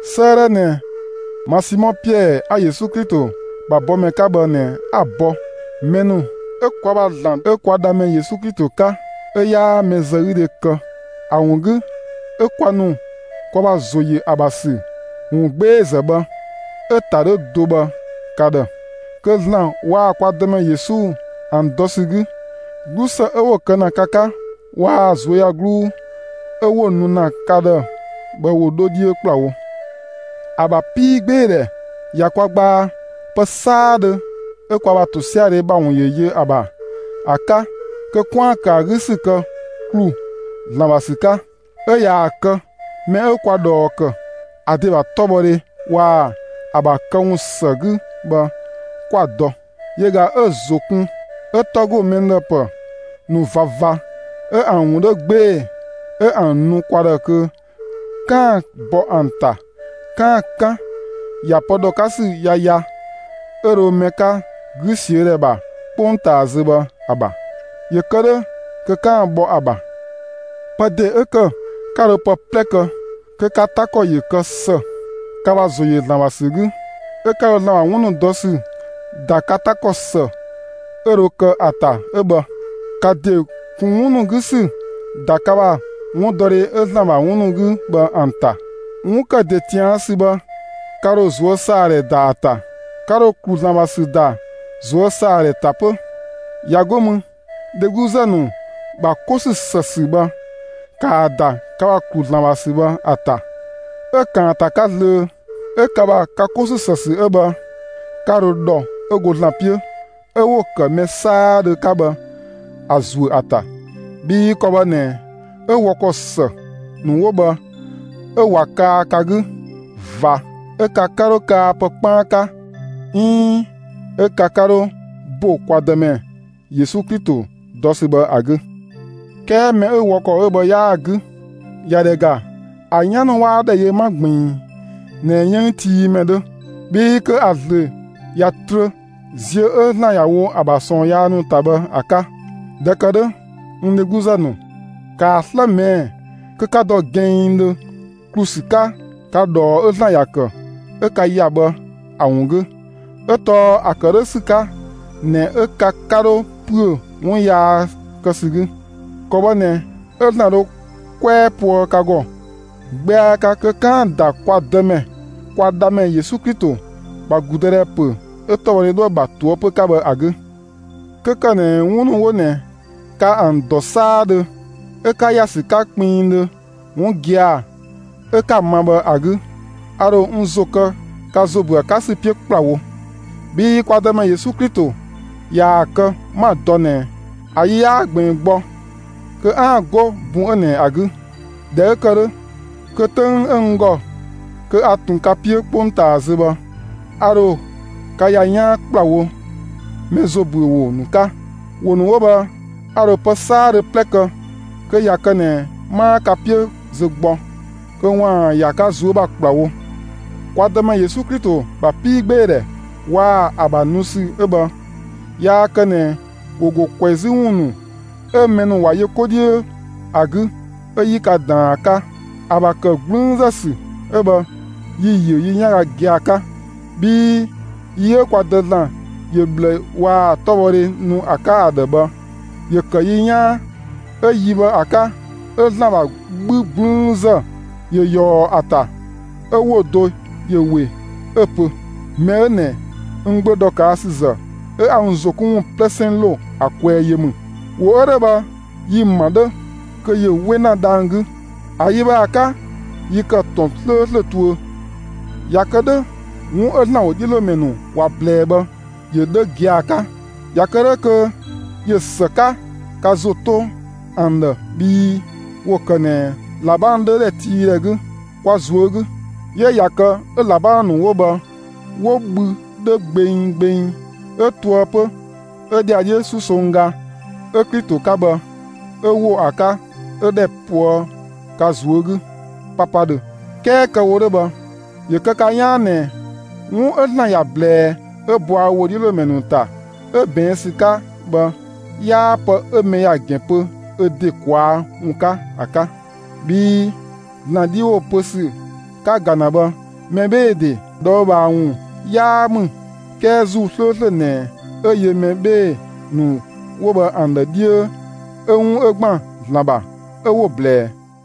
'Sëëdhɛ ꞊nɛ ma Simɔ Piɛɛ 'a Yesu Klito ‑bha bɔmɛ 'ka bhë ꞊nɛ 'a‑ bɔ mɛ ‑nu 'ö kwa ‑bha ‑Zlan 'ö kwa Dhamɛ Yesu Klito 'ka 'ö 'yaa mɛzëgüdhe kë ‑a ‑wun 'gü 'ö kwa ‑nu kwa ‑bha ‑zo ‑yö ‑a ‑bha ‑sü ‑wungbeezë bhë, 'ö‑ ‑ta 'dhö do bhë, ka ‑dhë. Kö ‑Zlan waa‑ kwa Dëmɛ Yesu ‑an dɔ ‑sü 'gü, 'glusë 'ö 'wo‑ kë ‑na ka 'ka waa‑ ꞊zuöyagluu 'ö 'wo‑ nu ‑na ka ‑dhë bhë ‑wo 'dho 'dhiö ‑kplawo. ‑A ‑bha 'piigbeedhɛ ꞊ya kwa gbaa pë 'saadhö 'ö kwa ‑bha ‑tosiadhe ‑bha ‑wun ‑yö yö ‑a ‑bha ‑a 'ka kö 'kwaan‑ ‑kë ‑a 'gü ‑sü kë ‑klu ‑Zlan ‑bha ‑sü 'ka; 'ö ꞊yaa‑ kë mɛ 'ö kwa ꞊dhɔɔ ‑kë ‑a ‑de ‑bha 'tɔbhɔdhe waa‑ ‑a ‑bha këwun ‑së 'gü bhë 'kwa‑ dɔ. Yö ꞊ga 'ö‑ ‑zo kun, 'ö 'tɔ ‑go mɛ ‑dhë ‑pë ‑nu ꞊vava 'ö ‑an ‑wun 'dhö 'gbee‑, 'ö ‑an nu kwa ‑dhë kö 'kaan‑ bɔ ‑an ‑ta 'kaan‑ 'kan ‑ya pë ‑dhɔ 'ka ‑sü yaya 'ö dho mɛ 'ka 'gü ꞊siö' ‑dhɛ ‑bha 'kpongtaa zö bhë ‑a ‑bha. ‑Yö kë 'dhö kö 'kaan‑ bhɔ ‑a ‑bha. Pë ‑de 'ö ‑kë 'ka dho pë 'plɛ kë kö ka 'ta ‑kɔ ‑yö kë ‑së, ka ‑bha ‑zo yö ‑Zlan ‑bha ‑sü 'gü, 'ö 'ka dho ‑Zlan ‑bha 'wun ‑nu dɔ ‑sü ‑da ka 'ta ‑kɔ ‑së 'ö dho kë ‑a ‑ta 'ö bhë. ‑Ka ‑de ‑kun 'wun ‑nu 'gü ‑sü ‑da ka ‑bha 'wundɔdhe 'ö ‑Zlan ‑bha 'wun ‑nu 'gü bhë ‑an ‑ta; 'wun ‑kë ‑de ꞊tian' ‑sü bhë, ka ‑dho ꞊zuösaadhɛ ‑da ‑a ‑ta; ka ‑dho ‑klu ‑Zlan ‑bha ‑sü ‑da ꞊zuösaadhɛ ‑ta 'pö. ꞊Ya 'go mü, dhegluzë ‑nu ‑bha 'ko ‑sü ‑së ‑sü bhë, ‑kaa ‑da ka ‑bha ‑klu ‑Zlan ‑bha ‑sü bhë ‑a ‑ta. 'Ö ‑kaanta 'ka zlöö, 'ö ka ‑bha ka 'ko ‑sü ‑së ‑sü 'ö bhë, 'ka dho ‑dhɔ 'ö go ‑Zlan 'piö 'ö 'wo‑ ‑kë mɛ 'saadhö 'ka bhë ‑a ‑zuö ‑a ‑ta. Bhii ‑kɔ bhë ꞊nɛ 'ö wɔ ‑kɔ ‑së ‑nu 'wo bhë 'ö ꞊wa kaa ka 'gü ꞊va 'ö ka 'ka 'dho kaa pë 'kpaan 'ka 'iin 'ö ka 'ka 'dhö ‑bo kwa Dëmɛ Yesu Klito dɔ ‑sü bhë ‑a 'gü. 'Kɛɛ mɛ 'ö wɔ ‑kɔ 'ö bhë 'yaa‑ 'gü, ꞊ya ‑dhɛ ‑ga, ‑a 'yan ‑nu 'waa ‑dhɛ yö 'ma ꞊gbiin ꞊nɛ 'yënngtiimɛ 'dhö, bhii kö ‑a ꞊zlöö ꞊ya trö ziö 'ö ‑Zlan ‑ya wo ‑a ‑bha ꞊sɔɔn yaa ‑nu ‑ta bhë ‑a 'ka. ꞊Dhɛ ‑kë 'dhö, n dhegluzë ‑nu, ‑kaa 'slë ꞊mɛɛ'‑ kö 'ka dɔ gɛnngdhö ‑klu ‑sü 'ka ka ꞊dhɔɔ 'ö ‑Zlan ‑ya ‑kë 'ö ka ‑ya bhë ‑a 'wun 'gü; 'ö tɔɔ ‑a ‑kë 'dhö ‑sü 'ka ꞊nɛ 'ö ka 'ka 'dho ‑püö 'wun yaa kë ‑sü 'gü. ‑Kɔ bhë ꞊nɛ 'ö ‑Zlan dho 'kwɛɛ poë ka ‑gɔ 'gbɛa 'ka kö 'kaan‑ ‑da kwa Dëmɛ, kwa Dhamɛ Yesu Klito ‑bha ‑gludëdhɛ ‑pö 'ö 'tɔbhɔdhɛ 'dhoë‑ ‑bha ꞊toëpö 'ka bhë ‑a 'gü. 'Kö ‑kë ꞊nɛ 'wun ‑nu 'wo ꞊nɛ 'ka ‑an dɔ 'saadhö 'ö 'ka ‑ya ‑sü 'ka kpinngdhö 'wun gia‑ 'ö 'ka‑ ma bhë ‑a 'gü, a ‑dho n ‑zo kë ka ‑zo ‑büö ‑a 'ka ‑sü 'piö ‑kplawo. Bhii kwa Dëmɛ Yesu Klito ꞊yaa‑ kë 'ma‑ dɔ ꞊nɛ ‑a yi 'yaa ꞊gbiin gbɔ kö 'aan‑ 'go bun 'ö ꞊nɛ ‑a 'gü. ꞊Dhɛ 'ö ‑kë 'dhö, kö 'töng 'ö n ‑gɔ kö a ꞊tun ka 'piö 'kpongtaa zö bhë, a ‑dho ka ‑ya 'yaan ‑kplawo mɛ ‑zo ‑büö ‑wo ‑nu 'ka. ‑Wo ‑nu 'wo bhë, a ‑dho pë 'saadhö 'plɛ kë kö ꞊ya kë ꞊nɛ 'maa ka 'piö zö gbɔ, kö ‑waan ‑ya ka ꞊zuö' ‑bha ‑kplawo. Kwa Dëmɛ Yesu Klito ‑bha 'piigbeedhɛ waa‑ ‑a ‑bha nu ‑sü 'ö bhë, yaa kë ꞊nɛ ‑wo ‑go ꞊kwɛzü ‑wun ‑nu 'ö mɛ ‑nu ‑wa yö 'ko 'dhiö ‑a 'gü 'ö 'yi ka ꞊daan ‑a 'ka. ‑A ‑bha ‑kë 'gblüünzë ‑sü 'ö bhë yi‑ ‑yö yi 'yanga gia‑ 'ka. Bhii yi 'ö kwa Dë ‑Zlan ‑yö ꞊bhlë waa‑ 'tɔbhɔdhe nu ‑a 'ka ‑a ‑dhë bhë, ‑yö ‑kë yi 'yaan, 'ö yi bhë ‑a 'ka 'ö ‑Zlan ‑bha 'bhü 'gblüünzë ‑yö ꞊yɔɔ ‑a ‑ta 'ö ‑wo do ‑yö ‑we 'ö‑ pö: Mɛ 'ö ꞊nɛ n Gbö ‑dhɔkaasüzë 'ö 'a n ‑zo 'kun ‑wun 'plɛsɛn ‑lo ‑a kwɛɛ yö ‑mü. ‑Wo 'ö 'dhö bhë, yi‑ ‑ma 'dhö kö ‑yö 'we ‑na dhang‑ 'gü. ‑A yi bhë ‑a 'ka, yi ‑kë ‑tɔn 'slööslö tuö. ꞊Ya kë 'dhö, 'wun 'ö ‑Zlan ‑wodhiölomɛ ‑nu ‑wa ꞊blɛɛ bhë ‑yö 'dhö gia‑ 'ka. ꞊Ya kë 'dhö kö ꞊yö ‑së 'ka ka ‑zo 'to ‑an ‑dhë bhii ‑wo kë ꞊nɛ ꞊labang 'dhö ‑dhɛtiidhɛ 'gü, kwa ꞊zuö' 'gü. 'Yö ꞊ya kë 'ö ꞊labang ‑nu 'wo bhë 'wo bhü 'dhö gbeng gbeng 'ö ‑toë 'pö 'ö ‑dhiadhiö 'susongga ('ö Klito 'ka bhë) 'ö ‑wo ‑a 'ka 'ö ‑dhɛ ꞊poë' ka ꞊zuö' 'gü ('papadhö). 'Kɛɛ kë‑ wo 'dhö bhë, ‑yö kë ka 'yaan ꞊nɛ 'wun 'ö ‑Zlan ‑ya ꞊blɛɛ 'ö bɔa ö ‑wodhiölomɛ ‑nu ‑ta 'ö ꞊bɛɛn' ‑sü 'ka bhë, 'yaa pë 'ö mɛ ‑ya ‑gɛn pö ö ‑de ꞊kwaa' ‑wun 'ka ‑a 'ka. Bhii ‑Zlan 'dhi ‑wo pö ‑sü 'ka‑ ‑ga ‑na bhë, mɛ 'bhee‑ ‑de ꞊dhɔɔbhaa ‑wun 'yaa ‑mü 'kɛɛ ‑Zuu 'slööslö ꞊nɛ 'ö yö mɛ 'bhee‑ ‑nu 'wo bhë ‑an ‑dhë 'dhiö 'ö 'wun 'ö ‑gban ‑Zlan ‑bha, 'ö 'wo‑ ꞊blɛɛ.